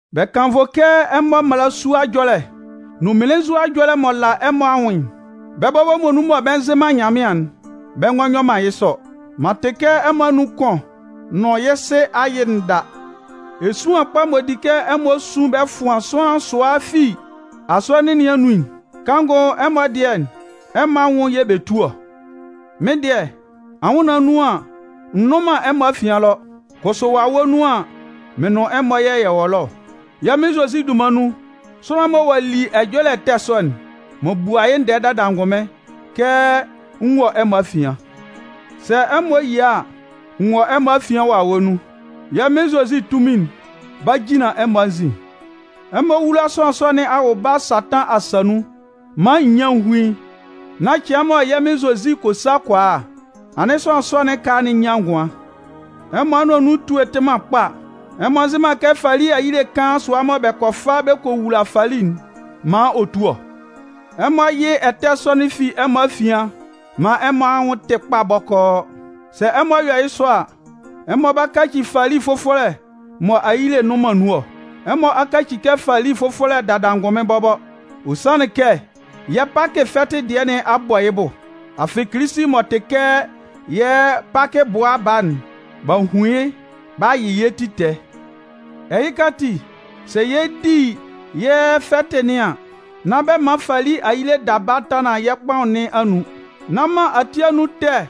Bɛ kannvʋ kɛ ɛmɔ mmalasua ɛjɔlɛ nʋn mmelenzua ɛjɔlɛ m'ɔ la ɛmɔ anwʋn'n, bɛ́ bɔbɔ muonun mɔ bɛ nzɩ man Nyanmɩan'n, bɛ ngɔ yɔ man yɩ́ sɔ. M'an tɩ kɛ ɛmɔ anun kʋn nʋn yɩ́ sɩ ayɩ'n da. Esuan kpa m'ɔ di kɛ ɛmɔ sun bɛ fʋan sʋanlan sʋa fi Asɔnɩn nɩn anun'n, kanngʋ ɛmɔ dɩɛ ɛmɔ anwʋn yɛ̂ bɛ tu ɔ. Mɩ́n dɩɛ, anwʋnnaan nun an, n nnʋn man ɛmɔ afian ɛlɔ, kʋsʋ wawɛ nun an, mɩn nʋn ɛmɔ yɛ̂ yɛ wɔ ɛlɔ. Yɛ́ Mɩn Zozi dunman nun, sʋanlan'n mɔ ɔ'a li ɛjɔlɛ ɛtɛ sɔ'n, m'an bua yɩ́ ndɛɛ dada angʋnmɩn kɛ n wɔ ɛmɔ afian. Sɛ ɛmɔ yia a, n wɔ ɛmɔ afian wawɛ nun. Yɛ́ Mɩn Zozi tunmin'n 'ba jinlan ɛmɔ anzin. Ɛmɔ wúla sʋanlan sɔ nɩn awʋba Satan asa nun maan nyian hún yɩ́ nán cɩan mɔ yɛ́ Mɩn Zozi kɔ sa kɔ a'n, anɩn sʋanlan sɔ nɩn ɛkala'n nyan ngʋan. Ɛmɔ anʋan nun etue'n tɩ man kpa. Ɛmɔ nzɩ man kɛ fali ayile kaan sʋa mɔ bɛ kɔ fa bɛ kɔ wula fali'n maan ɔ tu ɔ? Ɛmɔ yɩ́ ɛtɛ sɔ'n fi ɛmɔ afian maan ɛmɔ anwʋn tɩ́ kpa bɔkɔɔ. Sɛ ɛmɔ yɔ yɩ́ sɔ a, ɛmɔ 'ba kaci fali fʋfɔlɛ mɔ ayile nnʋn man nun ɔ. Ɛmɔ a kaci kɛ fali fʋfɔlɛ dada angʋnmɩn bɔbɔ. Ɔ sanlɩn kɛ yɛ́ Pakɩ fɛtɩ dɩɛ nɩn a bɔ yɩ́ bʋ. Afɩ Kilisi m'ɔ tɩ kɛ yɛ́ Pakɩ bʋa baa'n, b'a hun yɩ́ b'a yɩ yɛ́ ti tɛɛ. Ɛhɩka ati, sɛ yɛ 'di yɛ́ fɛtɩ nɩn an, nán bɛ man fali ayile daba tanlan yɛ́ kpaʋn nɩn anun. Nán man ati anun ɛtɛ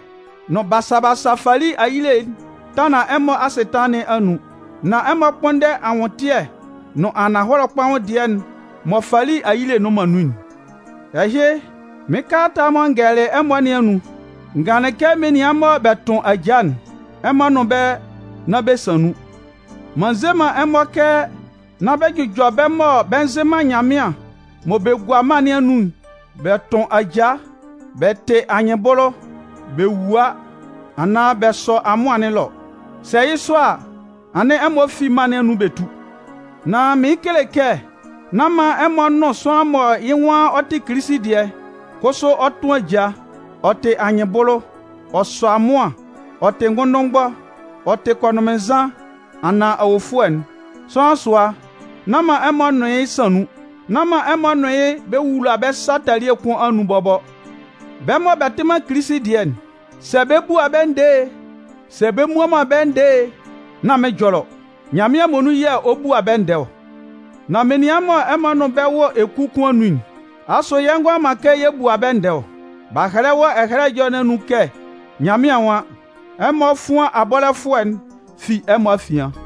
nʋn basa basa fali ayile'n tanlan ɛmɔ asɩtanlan nɩn anun. Nan ɛmɔ kpʋ́nndɛ anwʋntɩɛ nʋn ananhɔlɛ kpaʋn dɩɛ'n mɔ fali ayile nnʋn man nun'n. Ɛhɩ, mɩ́n kalata'n mɔ n gɛlɛlɩ ɛmɔ nɩn anun, n ganlɩn kɛ menian mɔ bɛ tʋn ajaa'n, ɛmɔ nʋn bɛ́ nán bɛ san nun. M'an nze man ɛmɔ kɛ nán bɛ jʋjɔ bɛ́ mɔ bɛ nzɩ man Nyanmɩan mɔ bɛ gua mân nɩn anun bɛ tʋn ajaa, bɛ tɩ anyɩnbʋlʋ, bɛ wua anaan bɛ sɔ amʋan nɩn ɛlɔ. Sɛ yɩ́ sɔ a, anɩn ɛmɔ fi mân nɩn anun bɛ tú! Nan mɩɩn kele kɛ nán man ɛmɔ nʋn sʋanlan mɔ yɩ́ nwan ɔ tɩ Kilisi dɩɛ, kʋsʋ ɔ tʋn ajaa, ɔ tɩ anyɩnbʋlʋ, ɔ sɔ amʋan, ɔ tɩ ngʋnndʋnmgbɔ, ɔ tɩ kɔnʋnmɩnnzan anaan awofʋɛ'n, sʋanlan sʋa, nán man ɛmɔ nʋn yɩ́ san nun. Nán man ɛmɔ nʋn yɩ́ bɛ wula bɛ́ sa talie kʋn anun bɔbɔ. Bɛ́ mɔ bɛ tɩ man Kilisi dɩɛ'n, sɛ bɛ 'bua bɛ́ ndɛɛ e, sɛ bɛ mmua man bɛ́ ndɛɛ e, nán mɩ́n ɛjɔlɛ ɔ. Nyanmɩan muonun yɛ̂ ɔ 'bua bɛ́ ndɛɛ ɔ. Nan menian mɔ ɛmɔ nʋn bɛ́ wɔ eku kʋn anun'n, asʋ yɛ ngʋala man kɛ yɛ bua bɛ́ ndɛɛ ɔ? B'a hɛlɛ wɔ Ɛhɛlɛ Ɛjɔlɛ nɩn anun kɛ Nyanmɩan nwan: Ɛmɔ fʋ́an abɔlɛfʋɛ'n fi ɛmɔ afian.